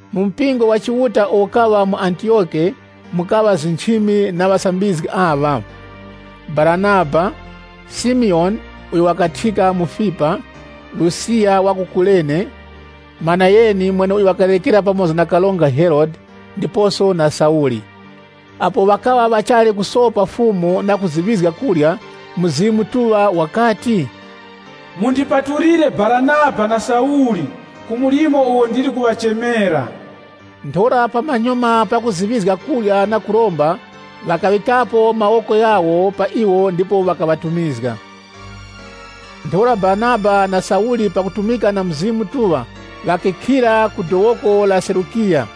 Mu mpingo wa Chiuta uwo ukaŵa mu Antiyoke, mukaŵa nchimi na ŵasambizgi aŵa: Baranaba, Simiyoni (uyo wakuthyika Mufipa), Lusiya wa ku Kurene, Manayeni (mweneuyo wakarerekera pamoza na Karonga Herode), ndiposo na Sauli Apo ŵakaŵa ŵachali kusopa Fumu na kuziŵizga kurya, Mzimu Mutuŵa wakati, “Mundipatulire Baranaba na Sauli ku mlimo uwo ndili kuŵachemera.” Ntheura pamanyuma pakuziŵizga kurya na kuromba, ŵakaŵikapo mawoko ghawo pa iwo ndipo ŵakaŵatumizga. Ntheura Baranaba na Sauli pakutumika na Mzimu Mutuŵa, ŵakikhira ku dowoko la Selukiya.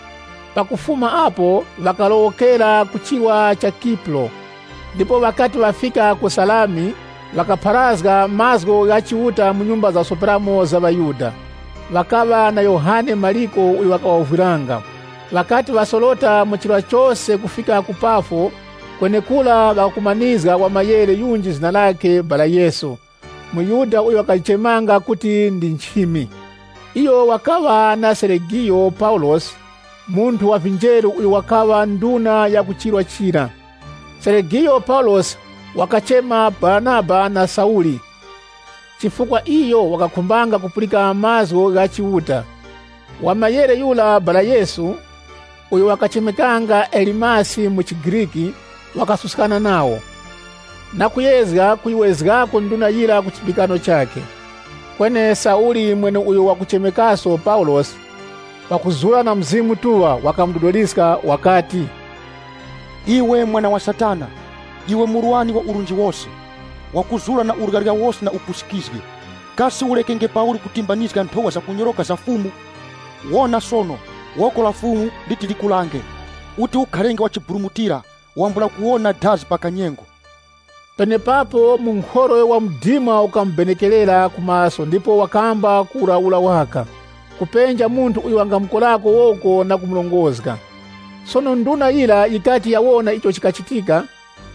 Pakufuma apo ŵakalowokera ku chirwa cha Kipuro. Ndipo ŵakati ŵafika ku Salami, ŵakapharazga mazgu gha Chiuta mu nyumba zakusoperamo za ŵaYuda. Ŵakaŵa na Yohane Mariko uyo wakaŵawovwiranga. Ŵakati ŵasorota mu chirwa chose kufika ku Pafosi, kwenekura ŵakakumanizga wa muwukwi yunji zina lakhe Bara Yesu, muYuda uyo wakaŵa nchimi ya utesi. Iyo wakaŵa na Seregiyo Paulosi, munthu wa vinjeru uyo wakaŵa nduna ya ku chirwa chira. Seregiyo Paulosi wakachema Baranaba na Sauli, chifukwa iyo wakakhumbanga kupulika mazgu gha Chiuta. Muwukwi yura Bara Yesu, uyo wakachemekanga Elimasi mu chiGriki, wakasuskana nawo, na kuyezga kuyiwezgako nduna yira ku chipulikano chakhe. Kweni Sauli, mweneuyo wakuchemekaso Paulosi, pakuzura na Mzimu Mutuŵa, wakamudodoliska, wakati, “Iwe mwana wa Satana, iwe murwani wa urunji wose, wakuzura na uryarya wose na upusikizgi, kasi urekenge pauli kutimbanizga nthowa zakunyoroka za Fumu? Wona sono, woko la Fumu liti likulange. Uti ukharenge wa chiburumutira, wambula kuwona dazi pa kanyengo.” Penepapo munkhorwe wa mdima ukamubenekerera ku maso ndipo wakamba kuwurawura waka, kupenja munthu uyo wangamukorako woko na kumurongozga. Sono nduna yira yikati yawona icho chikachitika,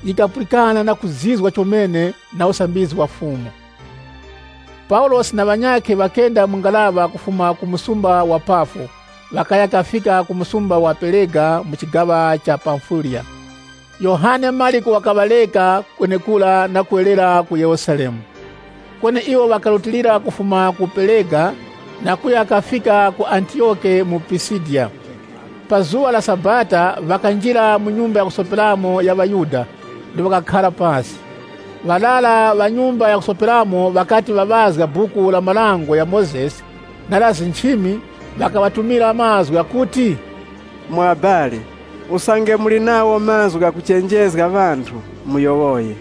yikapulikana na kuzizwa chomene na usambizgi wa Fumu. Paulosi na ŵanyakhe ŵakenda mu ngaraŵa kufuma ku msumba wa Pafosi, ŵakaya kafika ku msumba wa Perega mu chigaŵa cha Pamfiliya. Yohane Mariko wakaŵareka kwenekura na kuwerera ku Yerusalemu. Kweni iwo ŵakarutilira kufuma ku Perega, na kuya kafika ku Antiyoke mu Pisidiya. Pa zuŵa la Sabata ŵakanjira mu nyumba ya kusoperamo ya ŵaYuda ndipo ŵakakhara pasi. Ŵarara ŵa nyumba ya kusoperamo ŵakati ŵaŵazga Buku la Marango gha Mozesi na la nchimi, ŵakaŵatumira mazgu ghakuti, “Mwa ŵabali, usange muli nagho mazgu ghakuchenjezga ŵanthu, muyowoye.”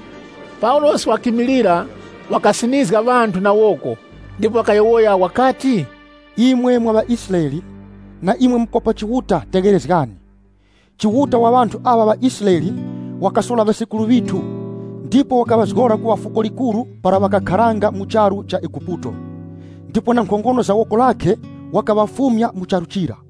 Paulosi wakimilira, wakasinizga ŵanthu na woko, ndipo wakayowoya wakati, “Imwe mwa ŵaIsraele, na imwe mukopa Chiuta, tegherezgani. Chiuta wa ŵanthu aŵa ŵaIsraele, wakasora ŵasekuru ŵithu, ndipo wakaŵazgora kuŵa fuko likuru para ŵakakharanga mu charu cha Eguputo. Ndipo na nkhongono za woko lakhe wakaŵafumya mu charu chira.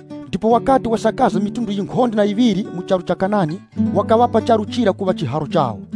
Ndipo wakati waparanya mafuko ghankhonde na ghaŵiri mu charu cha Kanani, wakaŵapa charu chira kuŵa chiharo chawo.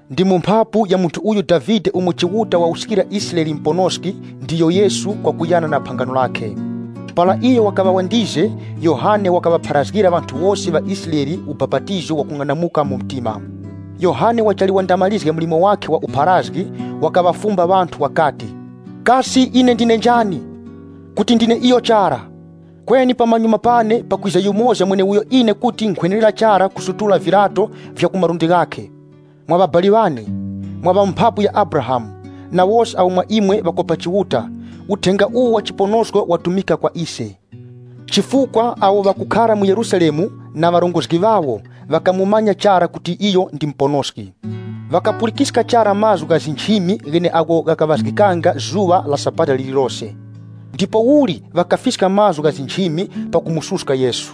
Ndi mu mphapu ya munthu uyu Davide umo Chiuta wawuskira Israele Muponoski, ndiyo Yesu, kwakuyana na phangano lakhe. Para iyo wakaŵa wandize, Yohane wakaŵapharazgira ŵanthu wose ŵaIsraele ubapatizo wakung'anamuka mu mtima. Yohane wachali wandamarizge mlimo wakhe wa upharazgi, wakaŵafumba ŵanthu wakati, ‘Kasi ine ndine njani? Kuti ndine iyo chara. Kweni pamanyuma pane, pakwiza yumoza mweneuyo ine kuti nkhwenerera chara kusutula viryato vya ku malundi ghakhe.’ “Mwa ŵabali ŵane, mwa ŵa mu mbumba ya Abrahamu, na wose awo mwa imwe ŵakopa Chiuta, uthenga uwu wa chiponosko watumika kwa ise. Chifukwa awo ŵakukhara mu Yerusalemu, na ŵarongozgi ŵawo, ŵakamumanya chara kuti iyo ndi Muponoski. Ŵakapulikiska chara mazgu gha nchimi gheneagho ghakaŵazgikanga zuŵa la Sabata lirilose. Ndipouli, ŵakafiska mazgu gha nchimi, pakumususka Yesu.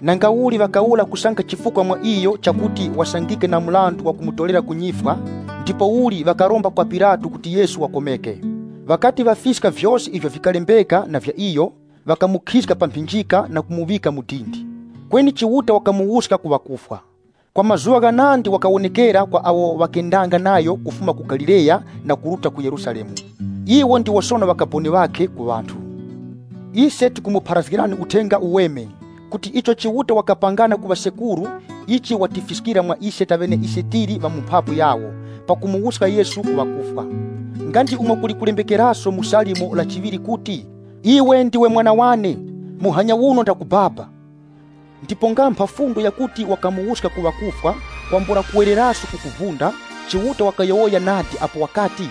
Nangauli ŵakawura kusanga chifukwa mwa iyo chakuti wasangike na mrandu wakumutorera ku nyifwa, ndipouli ŵakaromba kwa Pilato kuti Yesu wakomeke. Ŵakati ŵafiska vyose ivyo vikalembeka na vya iyo, ŵakamukhizga pa mphinjika na kumuŵika mu dindi. Kweni Chiuta wakamuwuska ku ŵakufwa. Kwa mazuŵa ghanandi wakawonekera kwa awo ŵakendanga nayo kufuma ku Galileya na kuruta ku Yerusalemu. Iwo ndiwo sono ŵakaboni ŵakhe ku ŵanthu. Ise tikumupharazgirani Uthenga Uweme, kuti icho Chiuta wakapangana ku ŵasekuru, ichi watifiskira mwa ise taŵeneise tili ŵa mu mphapu yawo, pakumuwuska Yesu ku ŵakufwa. Nga ndi umo kuli kulembekeraso mu Salimo la chiŵiri kuti, ‘Iwe ndiwe Mwana wane, muhanya uno ndakubaba.’ Ndipo nga mpha fundo yakuti wakamuwuska ku ŵakufwa, kwambula kuwereraso ku kuvunda, Chiuta wakayowoya nadi apo wakati;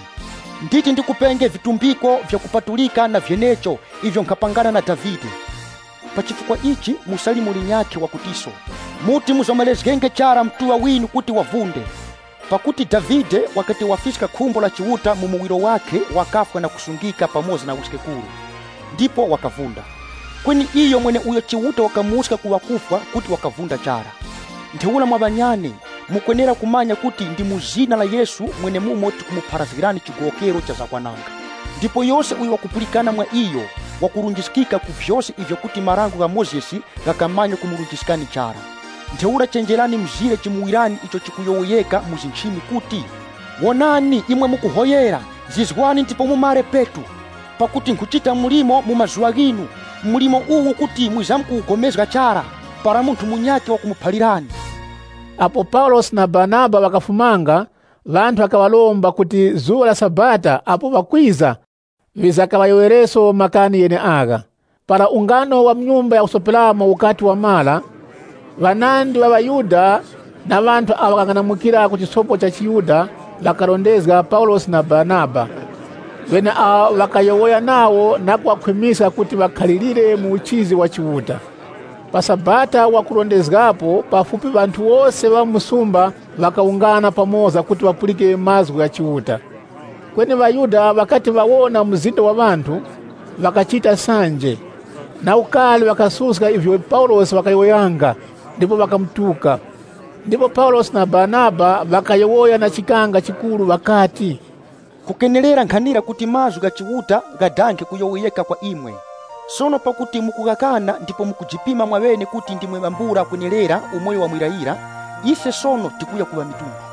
‘Nditi ndikupenge vitumbiko vyakupatulika na vyenecho, ivyo nkhapangana na Davide.’ (LXX) Pa chifukwa ichi mu Salimo linyakhe wakutiso: ‘Muti muzomerezgenge chara Mutuŵa winu Yura kuti wavunde.’ Pakuti Davide, wakati wafiska khumbo la Chiuta mu muwiro wakhe wakafwa na kusungika pamoza na wiskekuru, ndipo wakavunda. Kweni iyo mweneuyo Chiuta wakamuwuska ku ŵakufwa kuti wakavunda chara. Ntheura mwa ŵanyane, mukwenera kumanya kuti ndi mu zina la Yesu mwenemumo tikumupharazgirani chigowokero cha zakwananga. Ndipo yose uyo wakupulikana mwa iyo, wakurunjiskika ku vyose ivyo kuti Dango la Mozesi likamanya kumurunjiskani chara. Ntheura chenjerani mzire chimuwirani icho chikuyowoyeka mu nchimi kuti, ‘Wonani, imwe mukuhoyera, zizwani ndipo mumare petu. Pakuti nkhuchita mlimo mu mazuŵa ghinu, mlimo uwo kuti mwizamkupulikana nawo chara, para munthu munyakhe wakumuphalirani.’” (LXX) Apo Paulosi na Baranaba ŵakafumanga, ŵanthu ŵakaŵaromba kuti zuŵa la Sabata apo wakwiza ŵizakaŵayowoyereso makani gheneagha. Para ungano wa mu nyumba ya kusoperamo ukati wamara ŵanandi ŵa ŵaYuda na ŵanthu awo ŵakarondezga chiYuda, ŵakarondezga Paulosi na Baranaba, ŵeneawo ŵakayowoya nawo na kuŵakhwimiska kuti ŵakhalirire mu uchizi wa Chiuta. Pa Sabata wakurondezgapo pafupi ŵanthu wose mu msumba ŵakawungana pamoza kuti ŵapulike mazgu gha Chiuta. Kweni ŵaYuda ŵakati ŵawona mzinda wa ŵanthu, ŵakachita sanje. Na ukari ŵakasuska ivyo Paulosi wakayowoyanga ndipo wakamutuka. Ndipo Paulosi na Baranaba ŵakayowoya na chikanga chikuru ŵakati, “Kukenerera nkhanira kuti mazgu gha Chiuta ghadange kuyowoyeka kwa imwe. Sono pakuti mukughakana ndipo mukujipima mwaŵene kuti ndimwe ŵambula kwenerera umoyo wa muyirayira, ise sono tikuya ku ŵamitundu.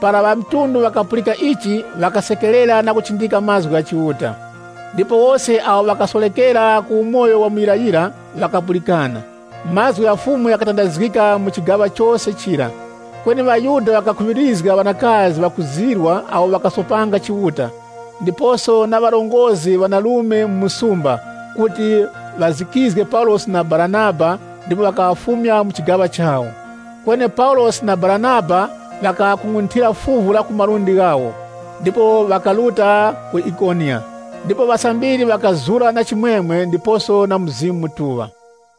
Para ŵamitundu ŵakapulika ichi, ŵakasekerera na kuchindika mazgu gha Chiuta. Ndipo wose awo ŵakasorekera ku umoyo wa muyirayira, ŵakapulikana. Mazgu gha Fumu ghakatandazgika mu chigaŵa chose chira. Kweni ŵaYuda ŵakakhuŵirizga ŵanakazi ŵakuzirwa awo ŵakasopanga Chiuta, ndiposo na ŵarongozgi ŵanarume mu msumba, kuti ŵazikizge Paulosi na Baranaba, ndipo ŵakaŵafumya mu chigaŵa chawo. Kweni Paulosi na Baranaba ŵakaŵakung'unthira fuvu la ku malundi ghawo, ndipo ŵakaruta ku Ikoniya. Ndipo ŵasambiri ŵakazura na chimwemwe ndiposo na Mzimu Mutuŵa.